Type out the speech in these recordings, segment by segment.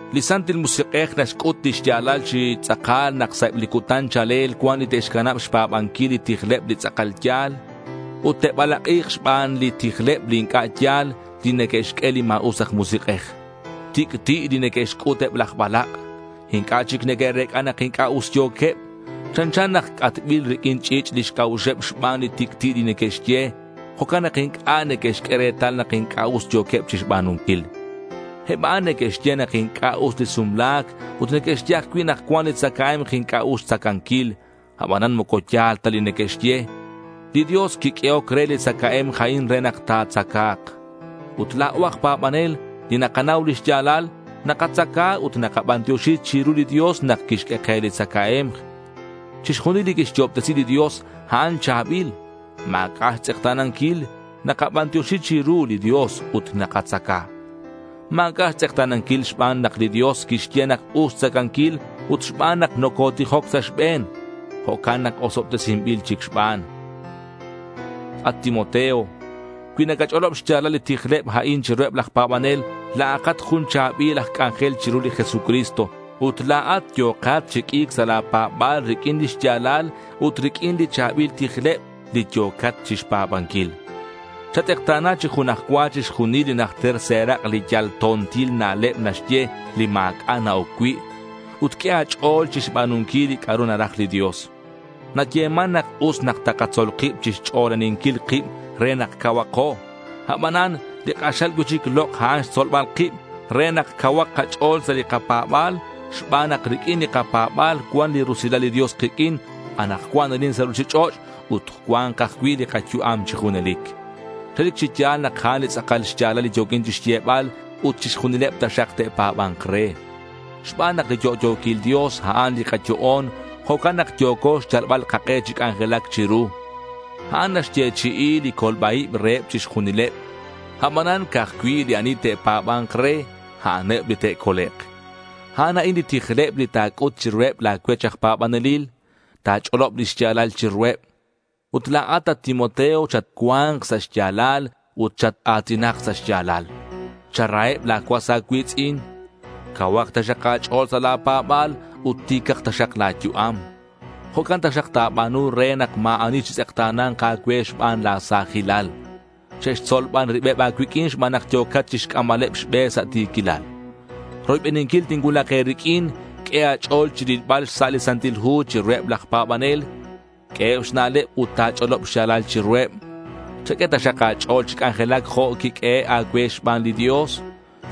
Li Santil Musik'ej naxc'ut li xya̱lal chi tz'akal nak sa' eb li cutan cha̱lel cuan li te'xcanab xpa̱banquil li tijleb li tz'akal ya̱l. Ut te'balak'i̱k xban li tijleb li inc'a' ya̱l li neque'xq'ue li ma̱us aj musik'ej. Tic'ti' li neque'xc'ut eb laj balak'. Inc'a' chic neque'rec'a nak inc'a' us yo̱queb. Chanchan nak c'atbil riq'uin ch'i̱ch' lix c'a'uxeb xban li tic'ti' li neque'xye. Jo'can nak inc'a' neque'xq'ue retal nak inc'a' us yo̱queb chixba̱nunquil. Eb a'an neque'xye nak inc'a' us li sumla̱c ut neque'xye ajcui' nak cuan li tzacae̱mk inc'a' us xtzacanquil. Abanan moco ya̱l ta li neque'xye. Li Dios quiq'uehoc re li tzacae̱mk a'in re nak ta̱tzaca̱k. Ut la̱o aj pa̱banel li nakanau li xya̱lal, nakatzaca ut nakabantioxi chiru li Dios nak quixq'ue ke li katzacae̱mk. Chixjunil li quixyo'obtesi li Dios, a'an cha̱bil. Ma̱c'a' xtz'ekta̱nanquil. Nakabantioxi chiru li Dios ut nakatzaca. Ma̱c'a' xtz'ekta̱nanquil xban nak li Dios quixye nak us xtzacanquil ut xban nak nocotijoc sa' xbe̱n. Jo'can nak osobtesinbil chic xban. At Timoteo, cui nacach'olob xya̱lal li tijleb a'in chiruheb laj pa̱banel, la̱akat jun cha̱bil aj c'anjel chiru li Jesucristo. Ut la̱at yo̱kat chi q'ui̱c sa' la̱ pa̱ba̱l riq'uin li xya̱lal ut riq'uin li cha̱bil tijleb li yo̱cat chixpa̱banquil. Chatz'ekta̱na chi jun aj cua chixjunil li najter serak' li yal to̱ntil na'leb naxye, li ma̱c'a' na-oc cui'. Ut q'ue a̱ch'o̱l chixba̱nunquil li c'a'ru naraj li Dios. Nayeman nak us nak takatzol kib chixch'olaninquil kib re nak cauhako. Abanan li k'axal cui'chic lok' a'an xtzolbal kib re nak cauhak kach'o̱l sa' li kapa̱ba̱l xban nak riq'uin li kapa̱ba̱l cuan li rusilal li Dios kiq'uin anakcuan arin sa' ruchich'och' ut cua̱nk ajcui' li kayu'am chi junelic. Relic chi ya̱l nak a'an li tz'akal xya̱lal li yo̱quin chixyebal, ut chixjunileb taxak te'pa̱ba̱nk re. Xban nak li yo'yo̱quil Dios, a'an li kayo'on, jo'can nak yo̱co xyalbal kak'e chi c'anjelac chiru. A'an naxyechi'i li colba-ib reheb chixjunileb. Abanan, ca'aj cui' li ani te'pa̱ba̱nk re, a'aneb li te'colek'. A'an a'in li tijleb li ta̱c'ut chiruheb la̱ cuech aj pa̱banelil. Ta̱ch'olob lix ya̱lal chiruheb. Ut la̱at, at Timoteo, chatcua̱nk sa' xya̱lal ut chat-a̱tinak sa' xya̱lal. Charaheb la̱ cuas a̱cui̱tz'in. Cauhak taxak a̱ch'o̱l sa' la̱ pa̱ba̱l ut ti̱cak taxak la̱ yu'am. Jo'can taxak ta̱ba̱nu re nak ma̱ ani chitz'ekta̱na̱nk a̱cue xban la̱ sa̱jilal. Che'xtzol ban ribeb a̱cuiq'uin xban nak yo̱kat chixc'ambaleb xbe sa' ti̱quilal. Roybeninquil tincuulak e̱riq'uin, q'ue a̱ch'o̱l chi rilbal xsa' li Santil Hu chiruheb laj pa̱banel. Q'ueheb xna'leb ut ta̱ch'olob xya̱lal chiruheb. Chaq'ue taxak a̱ch'o̱l chi c'anjelac jo' quiq'uehe' a̱cue xban li Dios.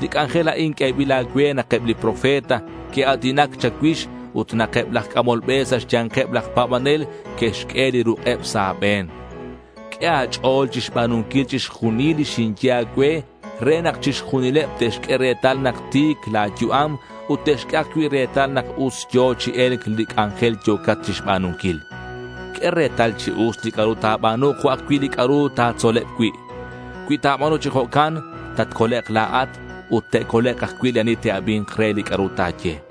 Li c'anjel a'in q'uebil a̱cue nak eb li profeta que'a̱tinac cha̱cuix ut nak eb laj c'amol be sa' xya̱nkeb laj pa̱banel que'xq'ue li ruk'eb sa' a̱be̱n. Q'ue a̱ch'o̱l chixba̱nunquil chixjunil li xinye a̱cue re nak chixjunileb te'xq'ue retal nak ti̱c la̱ yu'am ut te'xq'ue ajcui' retal nak us yo̱ chi e̱lc li c'anjel yo̱cat chixba̱nunquil. Q'ue retal chi us li c'a'ru ta̱ba̱nu jo' ajcui' li c'a'ru ta̱tzoleb cui'. Cui ta̱ba̱nu chi jo'can, tatcolek' la̱at ut te'colek' ajcui' li ani te'abi̱nk re li c'a'ru ta̱ye.